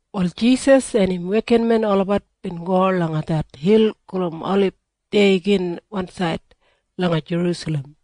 En Jisas en im wekinmen olabat bin go langa det hil gulum Olib deya gin wansaid langa Jerusalem.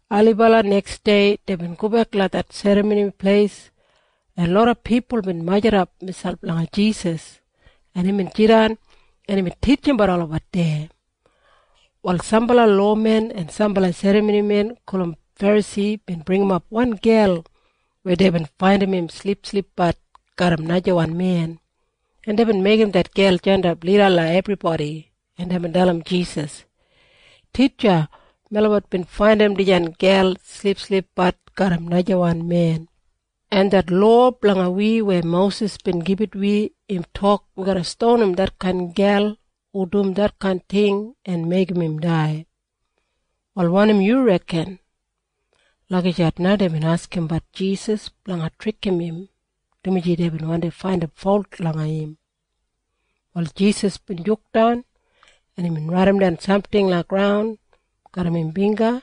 Ailibala neksdei deibin gobek langa det Serramoni Pleis, en loda pipul bin majurrumap miselp langa Jisas, en imbin jidan, en imbin titjimbat olabat deya. Wal sambala lowamen en sambala serramonimen gulum Ferasi bin bringimap wan gel weya deibin faindim im silipsilipbat garram najawan men, en deibin meigim det gel jandap lida langa ebribodi, en deibin dalim Jisas, “Titja, melabat bin faindim dijan gel silipsilipbat garram najawan men, en det lowa blanga wi weya Mosis bin gibit wi im tok wi garra stonim detkain gel hu dum detkain ting en meigim im dai. Wal wanim yu reken?” Lagijat na deibin askimbat Jisas blanga trikim im, dumaji deibin wandi faindim folt langa im. Wal Jisas bin jukdan, en imbin raidimdan samting langa graun garram im bingga,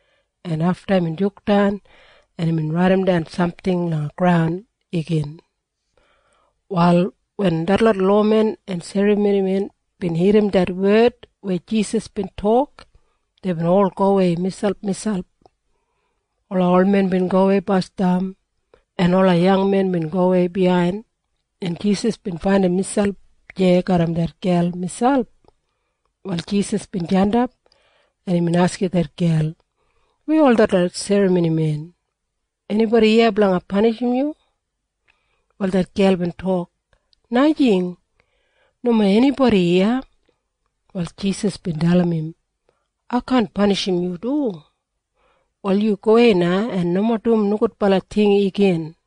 en afta imbin jukdan, en imbin raidimdan samting langa graun igin. Wal wen detlot lowamen en serramonimen bin irrim det wed weya Jisas bin tok, deibin ol gowei miselpmiselp. Ola olmen bin gowei basdam, en ola yangmen bin gowei biyain, en Jisas bin faindim miselp deya garram det gel miselp. Wal Jisas bin jandap, en imbin askim det gel, “Weya ol detlot serramonimen? Enibodi iya blanga panishim yu?” Wal det gel bin tok, “Najing. Nomo enibodi iya.” Wal Jisas bin dalim im, “Ai kaan panishim yu du. Wal yu gowei na en nomo dum nogudbala ting igin.”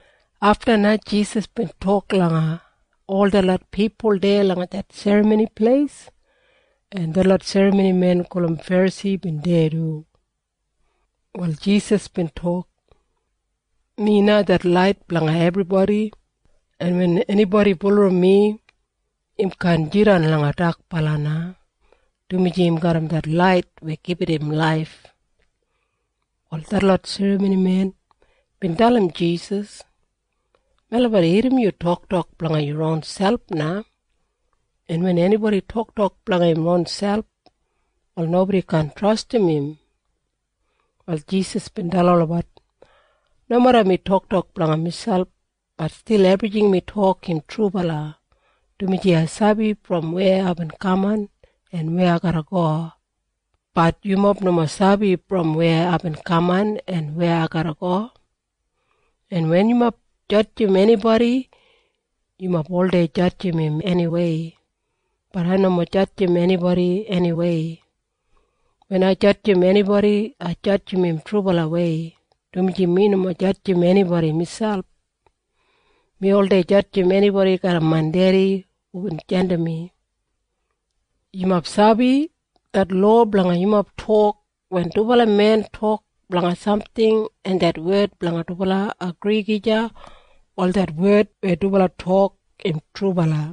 Afta na Jisas bin tok langa ol detlot pipul deya langa det Serramoni Pleis, en detlot serramonimen gulum Ferasi bin deya du. Wal Jisas bin tok, “Mi na det lait blanga ebribodi, en wen enibodi bulurrum mi, im kaan jidan langa dakbala na, dumaji im garram det lait weya gibit im laif.” Wal detlot serramonimen bin dalim Jisas, “Melabat irrim yu toktok blanga yu ronselp na, en wen enibodi toktok blanga im ronselp, wal nobodi kaan trastim im.” Wal Jisas bin dalim olabat, “Nomeda mi toktok blanga miselp, bat stil ebrijing mi tok im trubala, dumaji ai sabi brom weya aibin kaman en weya ai garra go. Bat yumob nomo sabi brom weya aibin kaman en weya ai garra go. En wen yumob jadjim enibodi, yumob oldei jadjim im eniwei. Bat ai nomo jadjim enibodi eniwei. Wen ai jadjim enibodi, ai jadjim im trubalawei, dumaji mi nomo jadjim enibodi miselp. Mi oldei jadjim enibodi garram main Dedi hubin jandim mi. “Yumob sabi? Det lowa blanga yumob tok, wen dubala men tok blanga samting en det wed blanga dubala agri gija, wal det wed weya dubala tok im trubala.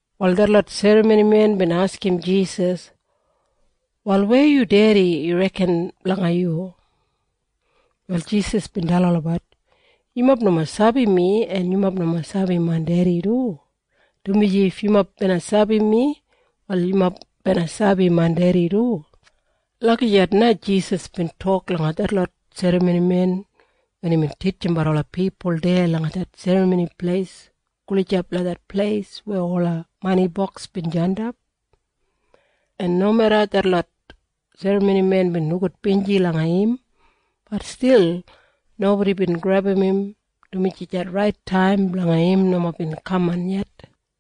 Wal detlot serramonimen bin askim Jisas, “Wal weya yu dedi yu reken blanga yu?” Wal, Jisas bin dalim olabat, “Yumob nomo sabi mi, en yumob nomo sabi main Dedi du, dumaji if yumob bina sabi mi, wal yumob bina sabi main Dedi du.” Lagijat na Jisas bin tok langa detlot serramonimen wen imbin titjimbat ola pipul deya langa det Serramoni Pleis gulijap langa det pleis weya ola maniboks bin jandap. En nomeda detlot serramonimen bin nogudbinji langa im, bat stil nobodi bin grebum im, dumaji det rait taim blanga im nomo bin kaman yet.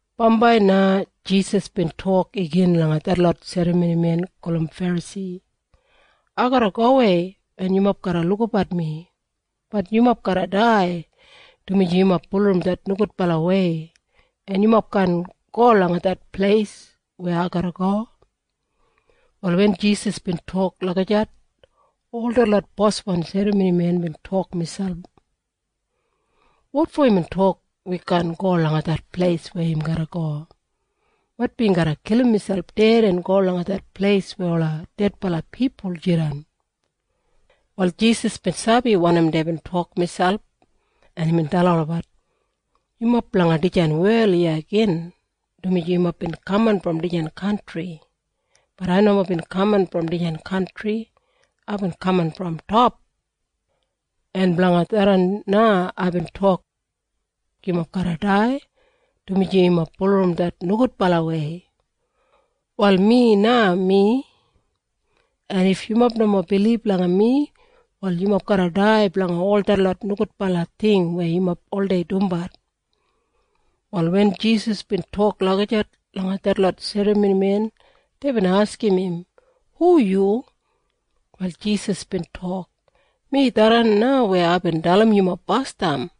Bambai na Jisas bin tok igin langa detlot serramonimen gulum Ferasi, “Ai garra gowei, en yumob garra lukabat mi. Bat yumob garra dai, dumaji yumob bulurrum det nogudbalawei, en yumob kaan go langa det pleis weya ai garra go.” Wal wen Jisas bin tok lagijat, ol detlot boswan serramonimen bin tok miselp, “Wotfo imbin tok wi kaan go langa det pleis weya im garra go? Maitbi im garra kilim miselp ded en go langa det pleis weya ola dedbala pipul jidan.” Wal Jisas bin sabi wanim deibin tok miselp, en imbin dalim olabat, “Yumob blanga dijan wel iya gin, dumaji yumob bin kaman brom dijan kantri. Bat ai nomo bin kaman brom dijan kantri. Aibin kaman brom top. En blanga tharran na aibin tok, ‘Yumob garra dai, dumaji yumob bulurrum det nogudbalawei.’ “Wal Mi na Mi. En if yumob nomo bilib langa mi, wal yumob garra dai blanga ol detlot nogudbala ting weya yumob oldei dumbat.” Wal wen Jisas bin tok lagijat langa detlot serramonimen, deibin askim im, “Hu yu?” Wal Jisas bin tok, “Mi tharran na weya aibin dalim yumob basdam.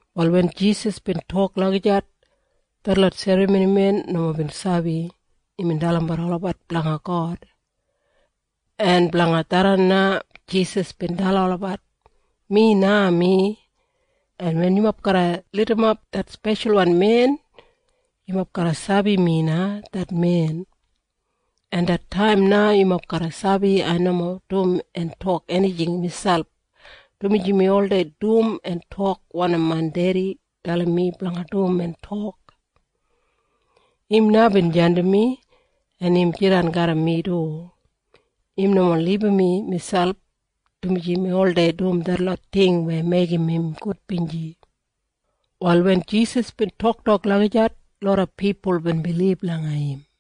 Wal wen Jisas bin tok lagijat, detlot serramonimen nomo bin sabi imbin dalimbat olabat blanga God. En blanga tharran na Jisas bin dalim olabat, “Mi na Mi. En wen yumob garra lidimap det Speshalwan Men, yumob garra sabi mi na det men. En det taim na yumob garra sabi ai nomo dum en tok enijing miselp, dumaji mi oldei dum en tok wanim main Dedi dalim mi blanga dum en tok. Im na bin jandim mi. En im jidan garram mi du. Im nomo libum mi miselp, dumaji mi oldei dum detlot ting weya meigim im gudbinji.” Wal wen Jisas bin toktok lagijat, loda pipul bin bilib langa im.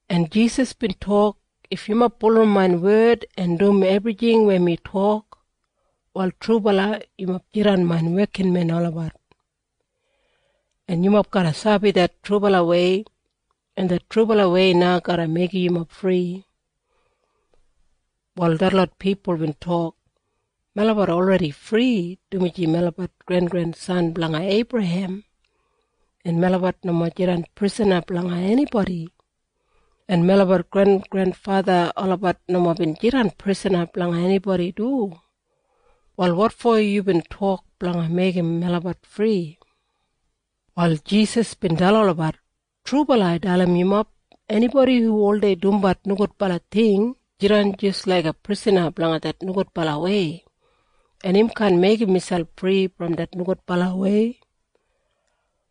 En Jisas bin tok, “If yumob bulurrum main wed en dum ebrijing weya mi tok, wal trubala yumob jidan main wekinmen olabat, en yumob garra sabi det trubalawei, en det trubalawei na garra meigim yumob fri.” Wal detlot pipul bin tok, “Melabat olredi fri, dumaji melabat grengrensan blanga Eibrahem, en melabat nomo jidan prisana blanga enibodi. En melabat grengrenfatha olabat nomo bin jidan prisana blanga enibodi du. Wal wotfo yubin tok blanga meigim melabat fri?” Wal Jisas bin dalim olabat, “Trubala ai dalim yumob. Enibodi hu oldei dumbat nogudbala ting jidan jis laiga prisana blanga det nogudbalawei, en im kaan meigim miselp fri brom det nogudbalawei.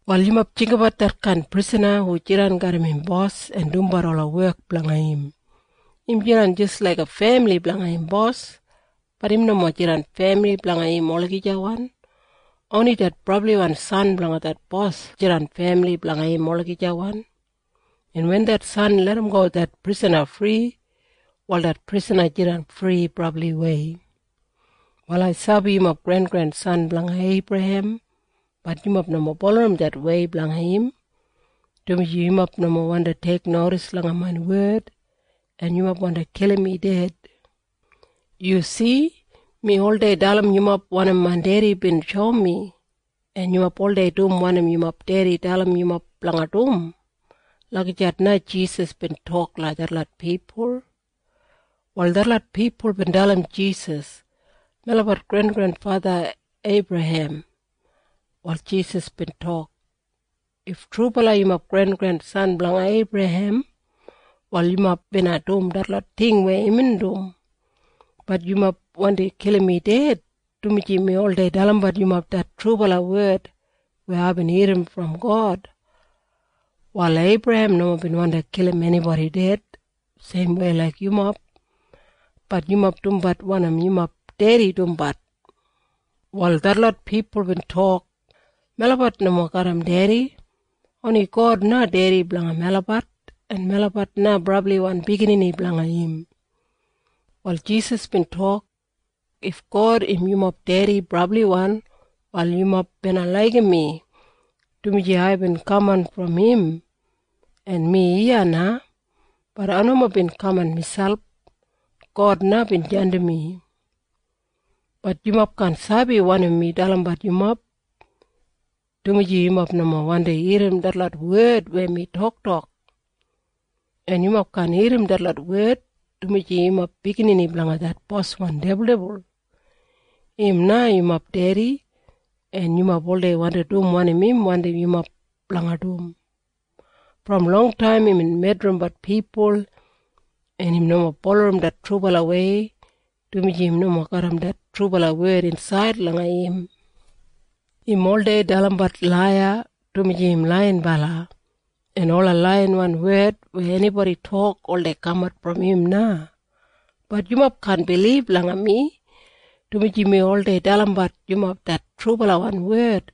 “Wal yumob jinggabat detkain prisana hu jidan garram im bos en dumbat ola wek blanga im. Im jidan jis laiga femili blanga im bos. Bat im nomo jidan femili blanga im olagijawan. Oni det brabliwan san blanga det bos jidan femili blanga im olagijawan. En wen det San larramgo det prisana fri, wal det prisana jidan fri brabliwei. “Wal ai sabi yumob grengrensan blanga Eibrahem. Bat yumob nomo bulurrum det wei blanga im, dumaji yumob nomo wandi teiknodis langa main wed, en yumob wandi kilim mi ded. Yu si? Mi oldei dalim yumob wanim main Dedi bin shoum mi. En yumob oldei dum wanim yumob dedi dalim yumob blanga dum.” Lagijat na Jisas bin tok langa detlot pipul. Wal detlot pipul bin dalim Jisas, “Melabat grengrenfatha Eibrahem.” Wal Jisas bin tok, “If trubala yumob grengrensan blanga Eibrahem, wal yumob bina dum detlot ting weya imbin dum. Bat yumob wandi kilim mi ded, dumaji mi oldei dalimbat yumob det trubala wed weya aibin irrim brom God. Wal Eibrahem nomo bin wandi kilim enibodi ded seimwei laik yumob. Bat yumob dumbat wanim yumob dedi dumbat.” Wal detlot pipul bin tok, “Melabat nomo garram dedi. Oni God na Dedi blanga melabat, en melabat na brabliwan biginini blanga im.” Wal Jisas bin tok, “If God im yumob Dedi brabliwan, wal yumob bina laigim mi, dumaji aibin kaman brom im, en mi iya na. Bat ai nomo bin kaman miselp. God na bin jandim mi. Bat yumob kaan sabi wanim mi dalimbat yumob, dumaji yumob nomo wandi irrim detlot wed weya mi toktok. En yumob kaan irrim detlot wed, dumaji yumob biginini blanga det boswan dibuldibul. Im na yumob dedi, en yumob oldei wandi dum wanim im wandim yumob blanga dum. Brom longtaim imbin medrimbat pipul, en im nomo bulurrum det trubalawei, dumaji im nomo garram det trubala wed insaid langa im. Im oldei dalimbat laiya, dumaji im laiyinbala, en ola laiyawan wed weya enibodi tok oldei kamat brom im na. Bat yumob kaan bilib langa mi, dumaji mi oldei dalimbat yumob det trubalawan wed.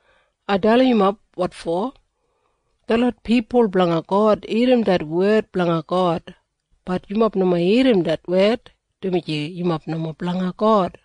Ai dalim yumob wotfo. Detlot pipul blanga God irrim det wed blanga God. Bat yumob nomo irrim det wed, dumaji yumob nomo blanga God.”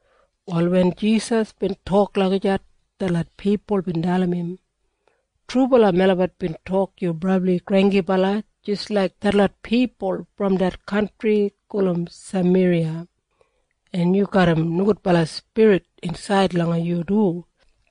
Wal wen Jisas bin tok lagijat, detlot pipul bin dalim im, “Trubala melabat bin tok yu brabli granggibala jis laik detlot pipul brom det kantri gulum Sameriya, en yu garram nogudbala spirit insaid langa yu du.”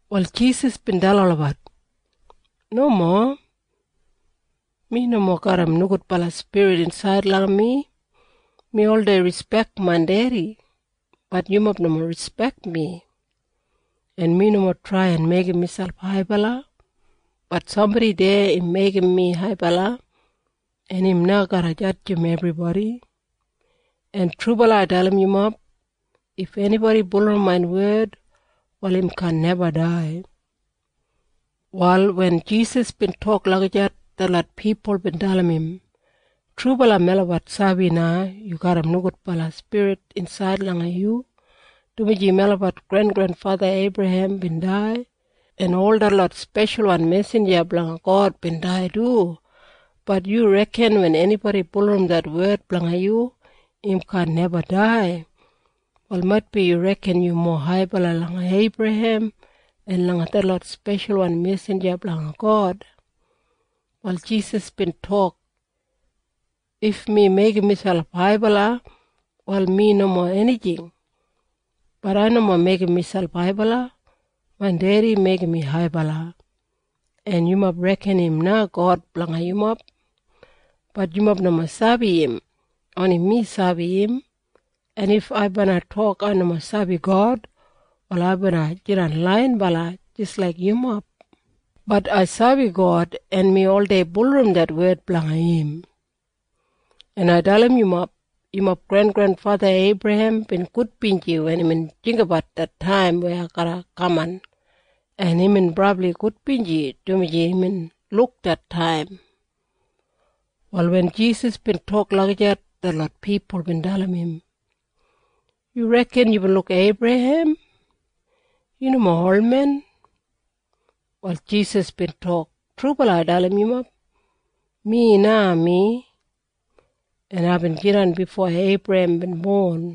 Wal Jisas bin dalim olabat, “Nomo. Mi nomo garram nogudbala spirit insaid langa mi. Mi oldei rispek main Dedi. Bat yumob nomo rispek mi. En mi nomo trai en meigim miselp haibala. Bat sambodi deya im meigim mi haibala. En im na garra jadjim ebribodi. En trubala ai dalim yumob. If enibodi bulurrum main wed, wal im kaan neba dai.” Wal wen Jisas bin tok lagijat, detlot pipul bin dalim im, “Trubala melabat sabi na yu garram nogudbala spirit insaid langa yu, dumaji melabat grengrenfatha Eibrahem bin dai, en ol detlot speshalwan mesinja blanga God bin dai du. Bat yu reken wen enibodi bulurrum det wed blanga yu, im kaan neba dai. Wal maitbi yu reken yu mowa haibala langa Eibrahem en langa detlot speshalwan mesinja blanga God.” Wal Jisas bin tok, “If mi meigim miselp haibala, wal mi nomo enijing. Bat ai nomo meigim miselp haibala. Main Dedi meigim mi haibala. En yumob reken im na God blanga yumob. Bat yumob nomo sabi im. Oni mi sabi im. En if ai bina tok ai nomo sabi God, wal ai bina jidan laiyinbala jis laik yumob. Bat ai sabi God, en mi oldei bulurrum det wed blanga im. En ai dalim yumob. Yumob grengrenfatha Eibrahem bin gudbinji wen imbin jinggabat det taim weya ai garra kaman. En imbin brabli gudbinji, dumaji imbin luk det taim.” Wal wen Jisas bin tok lagijat, detlot pipul bin dalim im, “Yu reken yubin luk Eibrahem? Yu nomo olmen.” Wal Jisas bin tok, “Trubala ai dalim yumob. Mi na Mi. En aibin jidan bifo Eibrahem bin bon.”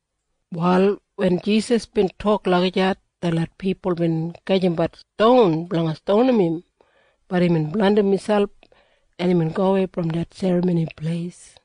Wal wen Jisas bin tok lagijat, detlot pipul bin gajimbat ston blanga stonim im. Bat imbin blandim miselp, en imbin gowei brom det Serramoni Pleis.